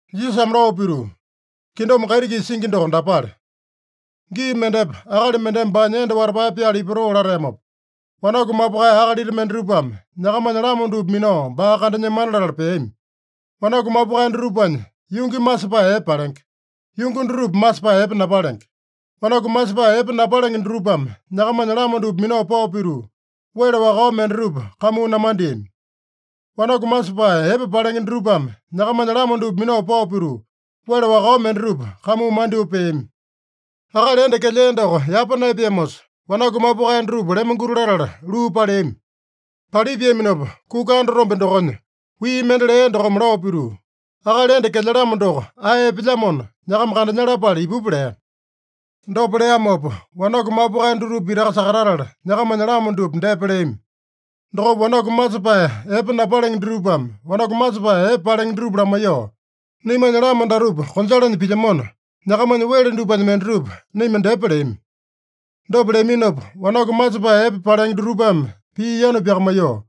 Jisasame lao pituu, “Kingdom kaiti-kisa singi doko dapale: Gii mendepa akali mendeme baanya enda watapae pyala ipatoo lateamopa, wanaku mapukae akalita mendatupame nyakamanya lama dupa minao baa kandanyemana latala peami. Wanaku mapukae dutupanya yungi masepae epe palenge. Yungi dutupa masepae epe napalenge. Wanaku masepae epe napalenge dutupame nyakamanya lama dupa minao pao pituu, wele wakao mendatupa kamuu namandeami. Wanaku masepae epe palenge dutupame nyakamanya lama dupa minao pao pituu, wele wakao mendatupa kamuu mandyoo peami. Akali enda kelyea doko yapa naepeamosa, wanaku mapukae dutupa lemonguti latala luu paleami. Palipiaminopa, kuka andatombe dokonya wii mende lea dokome lao pituu, ‘Akali enda kelyalamo doko ae epelyamona, nyakama kandanyalapale ipupa’ lea. Dopa leamopa, wanaku mapukae dutupa pitaka sakatatala, nyakamanya lama dupa depa leami. Dokopa wanaku masepae epe napalenge dutupame wanaku masepae epe palenge dutupa lamaiyoo, ‘Naimanya lama datupa konjalanya pilyamona, nyakamanya wele dupanya mendatupa naima dyepa’ leami. Dopa leaminopa, wanaku masepae epe palenge dutupame pii yanu pyakamaiyoo,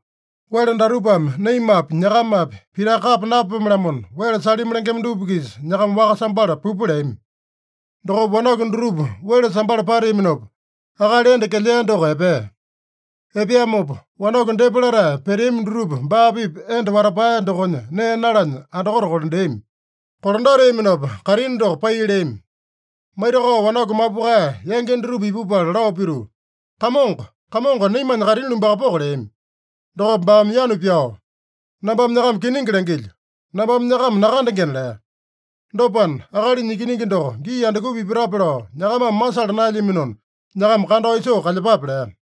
‘Wele datupame naimapi, nyakamapi pitaka kapa napapome-lamona, wele salimi lengema dupa-kisa nyakama waka sambala pupa’ leami. Dokopa wanaku dutupa wele sambala pateaminopa, akali enda kelyea doko epea. Epeamopa wanaku depa latae peteami dutupa baa-pipa enda watapae dokonya nee nalanya andakote kolandeami. Kolandateaminopa kaitini doko pai leami. Maitakao wanaku mapukae yangi dutupa ipupala lao pituu, ‘Kamongo, Kamongo, naimanya kaitini lumbakapoko’ leami. Dokopa baame yanu pyao, ‘Nambame nyakama kiningi langilyo: Nambame nyakama nakandengena’ lea. Dopana, Akalinya Ikiningi doko gii andukupa ipatape lao nyakamame masala naelyaminona, nyakama kandao isoo kalyepape” lea.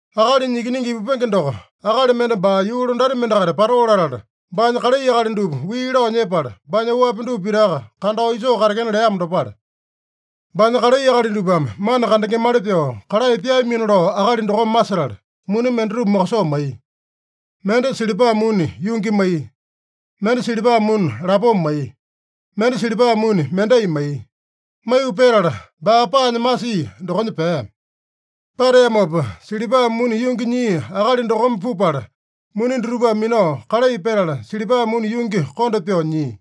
“Akalinya Ikiningi ipupenge doko, akali mende baa yuu londati mendakaita patoo latala, baanya kalai akali dupa wii lao nyepala, baanya oapi dupa pitaka kandao isoo katekena leamo dopale. Baanya kalai akali dupame mana kandengemali pyoo kalai pyaamino lao akali dokome masetala, muni mendatupa mokosoo maiya. Mende silipa muni yungi maiya. Mende silipa muni lapoma maiya. Mende silipa muni mendai maiya. Maiyu petala baa paanya masia dokonya pea. Pateamopa silipa muni yungi nyia akali dokome pupala, muni dutupame minao kalai petala, silipa muni yungi konda pyoo nyia.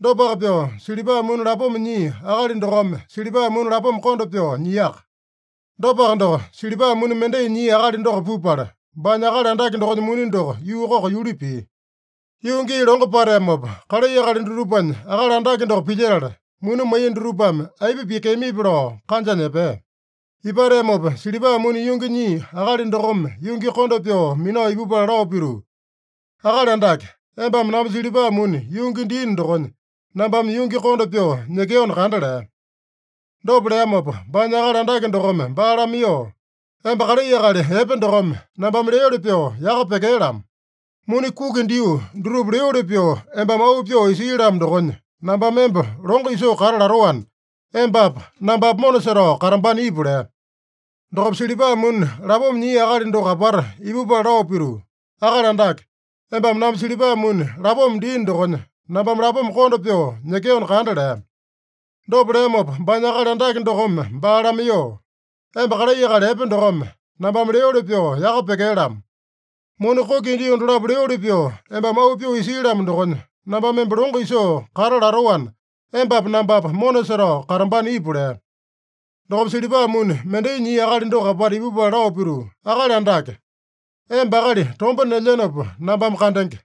Dopaka pyoo, silipa muni lapoma nyia akali dokome silipa muni lapoma konda pyoo nyiaka. Dopaka doko, silipa muni mendai nyia akali doko pupala, baanya akali andake dokonya muni doko yuu koko yuli pia. “Yuu gii longo pateamopa, kalai akali dutupanya akali andake doko pilyetala, muni maiya dutupame aipa pyekeamipi lao kanjanya epea. Ipateamopa silipa muni yungi nyia akali dokome yungi konda pyoo minao ipupala lao pituu, ‘Akali Andake, embame namba silipa muni yungi diino dokonya, nambame yungi konda pyoo nyekeona kanda’ lea. Dopa leamopa, baanya akali andake dokome baa lamaiyoo, ‘Emba kalai akali epe dokome, nambame leoli pyoo yaka pyekee-lamo! Muni kuki dio dutupa leoli pyoo, embame auu pyoo isii-lamo dokonya, nambame emba longo isoo kata latoana, embapa nambapa mona setao katambana ipu’ lea. Dokopa silipa muni lapoma nyia akali doko apata ipupala lao pituu, ‘Akali Andake, embame namba silipa muni lapoma diino dokonya, nambame lapoma konda pyoo nyekeona kanda’ lea. Dopa leamopa, baanya akali andake dokome baa lamaiyoo, ‘Emba kalai akali epe dokome, nambame leoli pyoo yaka pyekee-lamo! Muni kuki dio dolapo leoli pyoo, embame auu pyoo isii-lamo dokonya, nambame emba longo isoo kata latoana, embapa nambapa mona setao katambana ipu’ lea. Dokopa silipa muni mendai nyia akali doko apata ipupala lao pituu, ‘Akali Andake, emba akali tomba nelyenopa nambame kandenge.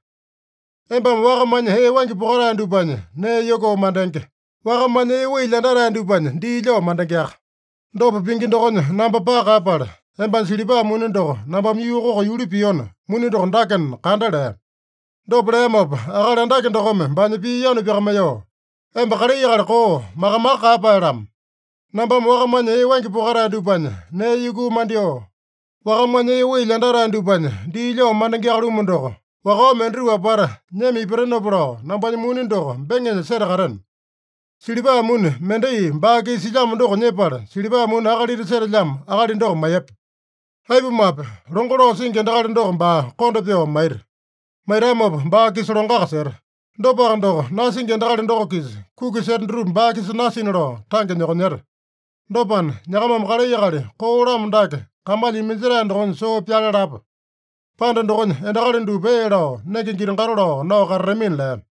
Embame wakamanya ee waingi pokatae dupanya nee yukuu mandenge. Wakamanya ee wai lyandatae dupanya dii lyao mandengeaka. Dopa pingi dokonya namba paka kaeyapala, embanya silipa muni doko nambame yuu koko yuli piona, muni doko dakena kanda’ lea. Dopa leamopa akali andake dokome baanya pii yanu pyakamaiyoo, ‘Emba kalai akali koo, maka-maka kaeyapae-lamo. Nambame wakamanya ee waingi pokatae dupanya nee yukuu mandyoo, wakamanya ee wai lyandatae dupanya dii lyao mandengeaka-lumu doko, wakao mendatupa apata nyema ipatenopa lao, nambanya muni doko beŋenya setakateno! Silipa muni mendai baa-kisa silyamo doko nyepala, silipa muni akalita setelyamo akali doko maiyepa. Aipumape, longo lao singi endakali doko baa konda pyoo maita. Maitamopa baa-kisa longoaka seta. Dopaka doko, nasingi endakali doko-kisa kuki seta dutupa baa-kisa nasina lao tange nyokonyeta. Dopana, nyakamame kalai akali koo-lamo dake kamalya iminjetae dokonya soo pyale lapa. Panda dokonya endakali dupa ee lao, nenge giti-gato lao nao katatamina’” lea.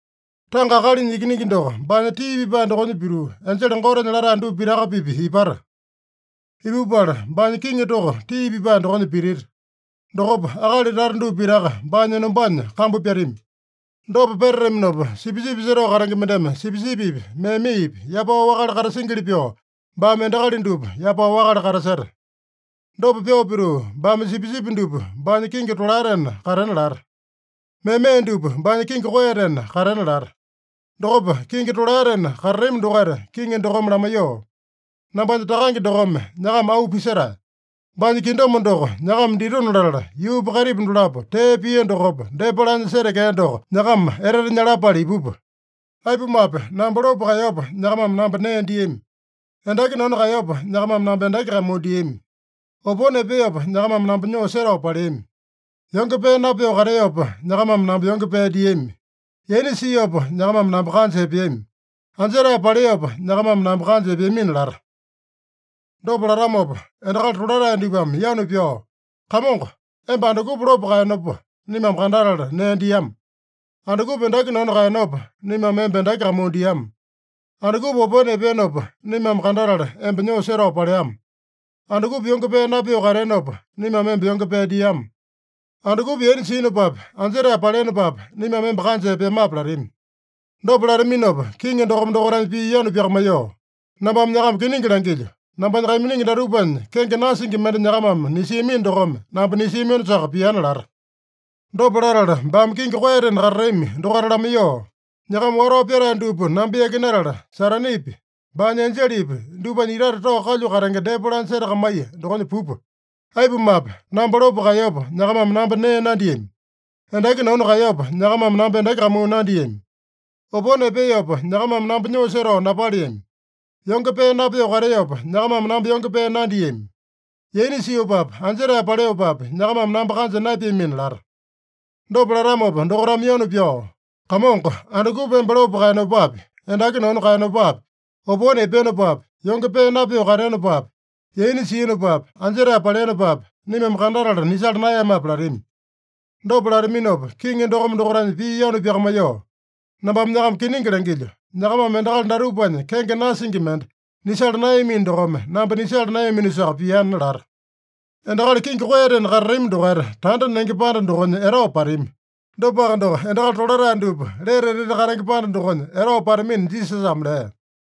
“Tanga Akalinya Ikiningi doko baanya tii pipae dokonya pituu, enjele Gotenya latae dupa pitaka-pipa ipata. Ipupala baanya kiŋi toko tii pipae dokonya pitita. Dokopa akali tata dupa pitaka baanya enombanya kambu pyatami. Dopa petataminopa, sipisipi setao katenge mendeme sipisipipi, memepi yapao wakale katasingili pyoo, baame endakali dupa yapao wakale kataseta. Dopa pyoo pituu, baame sipisipi dupa baanya kingi tolaetena katena lata. Meme dupa baanya kingi koeyatena katena lata. Dokopa kingi tolaetena katatami dokaita kiŋi dokome lamaiyoo, ‘Nambanya Takange dokome nyakama auu pisetae. Baanya kingdom doko nyakama ditona latala, yuupa kaitipa dolapo tee pia dokopa depa laanya setekea doko nyakama etete nyalapale ipupa. Aipumape, namba lopo kaeyopa, nyakamame namba nee diami. Endaki nanu kaeyopa, nyakamame namba endaki kamuu diami. Opone epeopa, nyakamame namba nyoo setao paleami. Yonge pee napyoo kateopa, nyakamame namba yonge pee diami. Yaina siopa, nyakamame namba kanja epeami. Anjetae paleopa, nyakamame namba kanja epeamina’ lata. Dopa latamopa, endakali tolatae dupame yanu pyao, ‘Kamongo, emba andukupa lopo kaeyenopa, naimame kandatala nee diama? Andukupa endaki nanu kaeyenopa, naimame emba endaki kamuu diama? Andukupa opone epeenopa, naimame kandatala emba nyoo setao paleama? Andukupa yonge pee napyoo kateenopa, naimame emba yonge pee diama? Andukupa yaina siinopapi, anjetae paleenopapi, naimame emba kanja epeamape?’ latami. Dopa lataminopa kiŋi dokome dokaitanya pii yanu pyakamaiyoo, ‘Nambame nyakama kiningi langilyo: Nambanya kaiminingi datupanya kenge nasingi mende nyakamame nisiamino dokome, namba nisiaminosaka piana’ lata. “Dopa latala baame kingi koeyatena katatami dokaita lamaiyoo, ‘Nyakama watao pyatae dupa namba yakinatala, Satanepi, baanya enjelepi dupanya itate tao kalyu katenge depa laanya setakamaiya dokonya pupa. Aipumape, namba lopo kaeyopa, nyakamame namba nee nandiami. Endaki nanu kaeyopa, nyakamame namba endaki kamuu nandiami. Opone epeopa, nyakamame namba nyoo setao napaleami. Yonge pee napyoo kateopa, nyakamame namba yonge pee nandiami. Yaina siopapi, anjetae paleopapi, nyakamame namba kanja naepeamina’ lata. Dopa latamopa dokaitame yanu pyao, ‘Kamongo, andukupa emba lopo kaeyenopapi, endaki nanu kaeyenopapi, opone epeenopapi, yonge pee napyoo kateenopapi, yaina siinopapi, anjetae paleenopapi, naimame kandatala nisala naeyamape?’ latami. Dopa lataminopa kiŋi dokome dokaitanya pii yanu pyakamaiyoo, ‘Nambame nyakama kiningi langilyo: Nyakamame endakali datupanya kenge nasingi mende nisala naeyamino dokome, namba nisala naeyaminosaka piana’ lata. Endakali kingi koeyatena katatami dokaita tanda nenge panda dokonya etao patami. Dopaka doko, endakali tolatae dupa lete etete katenge panda dokonya etao patamina” Jisasame lea.